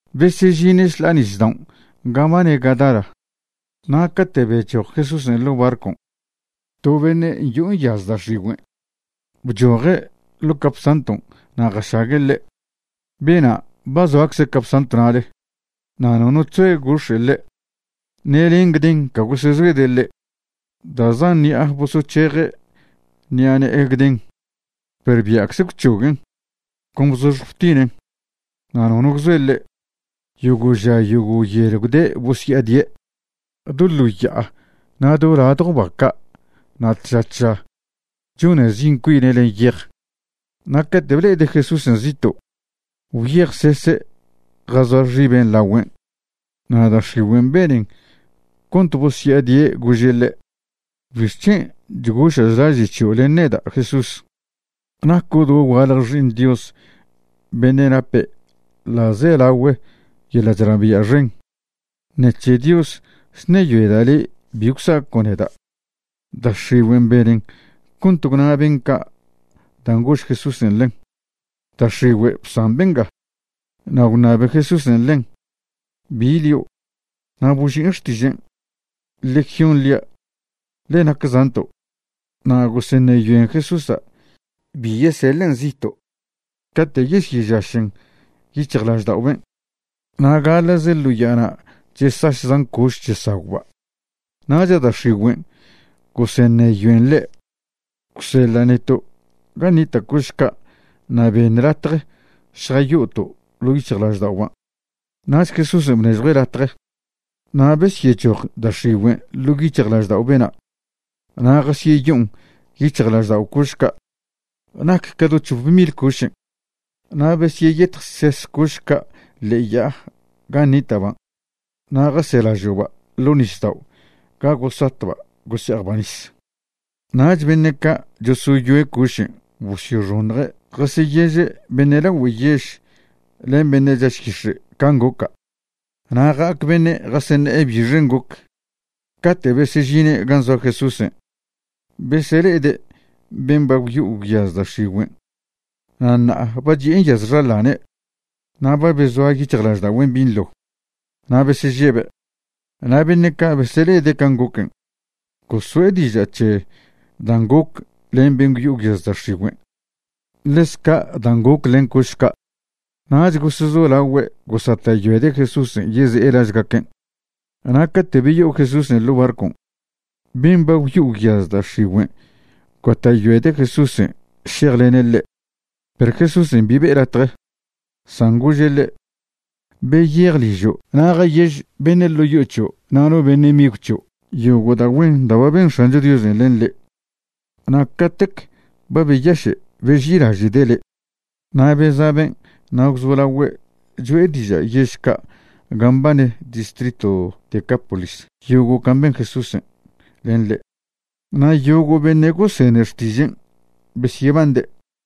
Besežine' šḻa'a nisdaon' gan' mbane Gadara, na' cate' bechoj Jesúsen' ḻo' barcon' to beṉe' yo'o nyaz da' x̱igüen' bchoje' ḻo' capsantw na' jašague' ḻe'. Bena' ba zoacze' capsantw na'le na' nono chzoe gox̱e' ḻe', ṉe len gden ca gosezoede' ḻe'. Da' zan ṉi'a bosoc̱heje' ṉi'a ne'e gden, perw bia'cze gwc̱hoguen', con bzoxj btinen', na' nono gwzoe ḻe'. Yogo' ža yogo' yel gwde' bosya'adie' do ḻo ya'a na' do ladjo ba ca' na' tža tža chone' zi' cuine' len yej. Na' cate' ble'ede' Jesúsen' zito' gwyejsese' jazoa xibe' lagüen', na' da' x̱igüen' benen cont bosya'adie' gože' ḻe': ―¿Bixc̱hen' chgoša' chlaže' c̱hio' len neda', Jesús? Naco' dogualje Xi'iṉ Dios beṉe' nape ḻa'zelagüe yeḻa' chnabia' xen. Ṉec̱he Dios chṉeyoeda' le' bi gwsaco' neda'. Da' x̱igüen' benen cont gwna ben' ca' dan' gož Jesúsen' ḻen: ―Da' x̱igüe', bsan benga. Na' gwṉabe Jesúsen' ḻen: ―¿Bi lio'? Na' boži'in xtižen': ―Legión lia', ḻe nac zanto'. Na' goseṉeyoen Jesúsa' bi yeseḻen' zito' cate' yesyežašen' yic̱hjlaždao' ben'. Na' gaḻa'ze ḻo ya'ana' chesaš zan coš chesagwba'. Nach da' x̱igüen' goseṉeyoen ḻe': ―Gwseḻa' neto' gan' nita' coš ca' na' beṉ latje šjayo'oto' ḻo' yic̱hjlažda'oban'. Nach Jesúsen' bnežjue' latje, na' besyechoj da' x̱igüen' ḻo' yic̱hjlaždao' bena' na' jasyeyo'on yic̱hjlaždao' coš ca'. Nac ca do c̱hop mil cošen'. Na' besyeyetjses coš ca' ḻe'e ya'a gan' nita'ban' na' jaselažo'ba' ḻo' nisdao' ga gosatba' gose'ejba' nis. Nach beṉe' ca' chosoyoe' cošen' bosyoxoṉje' jasyeyeže' beṉe' lagüe yež len beṉe' chaš yix̱e' can' goca'. Na' ja'ac beṉe' jaseṉe'e bixen' goc. Cate' besežine' gan' zoa Jesúsen' besele'ede' ben' ba gwyo'o gwyaz da' x̱igüen', na' ṉa'a ba chi'e nyaz xaḻane' na' ba bezoa yic̱hjlažda'ogüen' binḻo. Na' besežebe'. Na' beṉe' ca' besele'ede' can' goquen' goso'e diža' c̱he dan' goc len ben' gwyo'o gwyaz da' x̱igüen', ḻez ca' dan' goc len coš ca'. Nach gosezolagüe' gosata'yoede' Jesúsen' yeze'e lažgaquen'. Na' cate' beyo'o Jesúsen' ḻo' barcon' ben' ba gwyo'o gwyaz da' x̱igüen' gota'yoede' Jesúsen' šejlene' ḻe'. Perw Jesúsen' bi be'e latje, san gože' ḻe': ―Beyej ližo' na' jayež beṉe' ḻo' yo'o c̱hio' na' no beṉe' migw c̱hio' yogo' da' güen da' ba ben X̱ancho Diosen' len le' na' catec ba beyaše' beži'ilaže'de' le'. Na' beza' ben' na' gwzolagüe' cho'e diža' yež ca' gan' mbane distritw Decápolis yogo' can' ben Jesúsen' len ḻe', na' yogo' beṉe' gosene xtižen' besyebande'.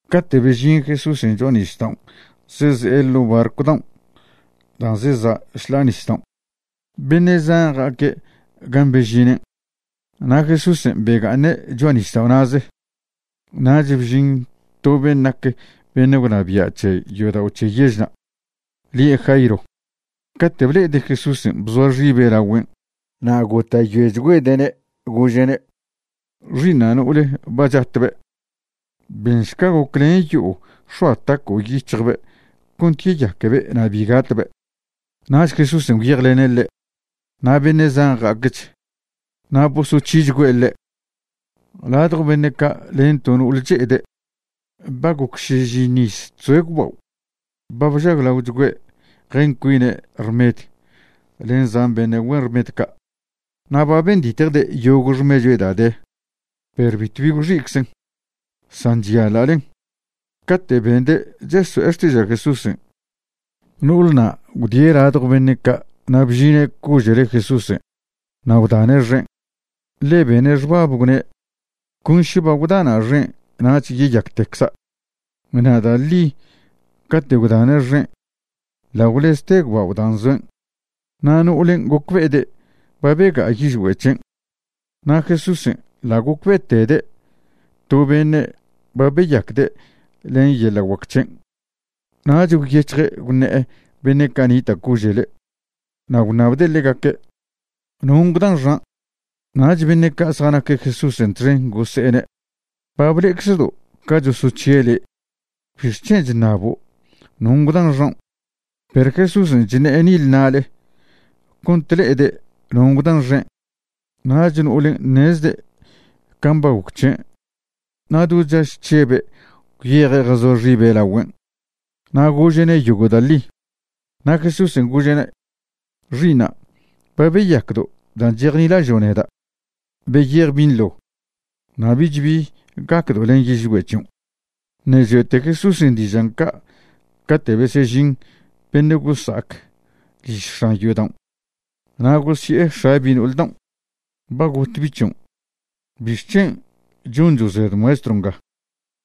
Cate' bežin Jesúsen' cho'a nisdaon' zeze'e ḻo' barcw daon' dan' zeza' šḻa'a nisdaon', beṉe' zan ja'aque' gan' bežinen', na' Jesúsen' bega'aṉe' cho'a nisdao' na'ze. Nach bžin to ben' nac beṉe' gwnabia' c̱he yodao' c̱he yežna', lie' Jairo. Cate' ble'ede' Jesúsen' bzoa xibe' lagüen' na' gota'yoechgüede'ne' gože'ne': ―Xi'iṉa' no'ole ba chatbe'. Benšca goclen yo'o x̱oa taco' yic̱hjbe' cont yeyaquebe' na' bi gatbe'. Nach Jesúsen' gwyejlene' ḻe'. Na' beṉe' zan ja'acch, na' bosoc̱hichgüe' ḻe'. Ladjo beṉe' ca' len to no'ol che'ede', ba goc šižiṉw iz chzoe' gwbao'. Ba bžaglaochgüe' jen cuine' rmed len zan beṉe' güen rmed ca', na' ba benditje' yogo' xmechue' da' de, perw bitwbi gwx̱i'czen, san chyaḻa'len. Cate' bende' cheso'e xtiža' Jesúsen', no'olna' gwdie' ladjo beṉe' ca' na' bžine' cože'le Jesúsen' na' gwdane' xen'. Ḻe bene' xbab, gwne': “Con še ba gwdana' xen' nach yeyactecza'.” Na' da' ḻi cate' gwdane' xen' ḻa' gwlezte gwbao' dan' zoen', na' no'olen' gocbe'ede' ba bega'a yižgüe' c̱hen'. Na' Jesúsen' ḻa' gocbe'etede' to beṉe' ba beyacde' len yeḻa' guac c̱hen', nach gwyec̱hje' gwṉe'e beṉe' ca' nita' cože'le, na' gwṉabde' ḻegaque': ―¿Non' gwdan xan'? Nach beṉe' ca' zjanaque' Jesúsen' txen gose'ene': ―Ba ble'eczedo' ca chosoc̱hie' le', ¿bixc̱hen' chṉabo' non' gwdan xaon'? Perw Jesúsen' chṉe'e nile na'le cont le'ede' non' gwdan xen'. Nach no'olen' ṉezde' can' ba goc c̱he' na' do chaž chžebe' gwyeje' jazoa xibe' lagüen' na' gože'ne' yogo' da' ḻi. Na' Jesúsen' gože'ne': ―Xi'iṉa', ba beyacdo' dan' chejnilažo' neda'. Beyej binḻo, na' bich bi gacdo' len yižgüe' c̱hion'. Ṉe' choe'te Jesúsen' dižan' ca' cate' besežin beṉe' gosa'ac liž x̱an yodaon', na' gosi'e x̱a bi' no'ol daon': ―Ba got bi' c̱hion', ¿bixc̱hen' choncho' zed Maestro nga?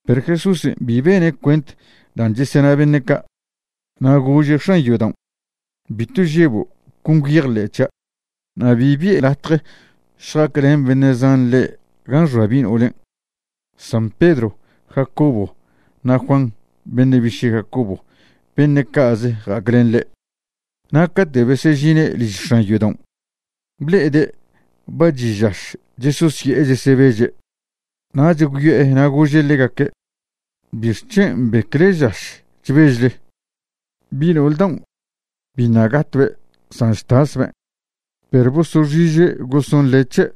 Perw Jesúsen' bi bene' cuent dan' chesena beṉe' ca', na' gože' x̱an yodaon': ―Bitw žebo', con gwyejḻe' c̱hia'. Na' bi bi'e latje šja'aclen beṉe' zan ḻe' gan' xoa bi' no'olen', san Pedro, Jacobo na' Juan beṉe' biše' Jacobo, beṉe' ca'ze ja'aclen ḻe'. Na' cate' besežine' liž x̱an yodaon', ble'ede' ba chi' žaš chesosye'e chesebeže'. Nach gwyo'e na' gože' ḻegaque': ―¿Bixc̱hen' mbecle žaš chbežle? Bi no'ol daon' biṉa' gatbe', san chtasben'. Perw bosoxiže' gosonḻe' c̱he'.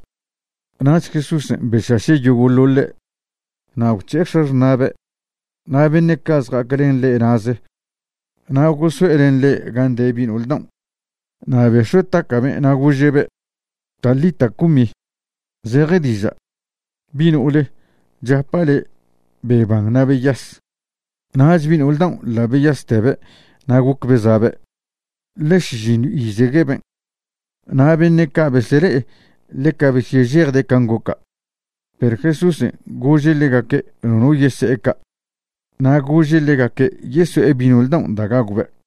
Nach Jesúsen' bešaše' yogo'ḻoḻe', na' gwc̱he'e x̱axṉa'be' na' beṉe' ca' zja'aclen ḻe' na'ze na' goso'e len ḻe' gan' de bi' no'ol daon'. Na' bex̱ue' taca'ben' na' gože'be': ―Talita, cumi ―zeje diža': Bi' no'ole, chapa' le' beban na' beyas. Nach bi' no'ol daon' ḻa' beyastebe' na' goc beza'be', ḻe šižiṉw izegueben'. Na' beṉe' ca' besele'e ḻeca besyežejde' can' goca'. Perw Jesúsen' gože' ḻegaque' nono yese'e ca', na' gože' ḻegaque' yeso'e bi' no'ol daon' da' gagwbe'.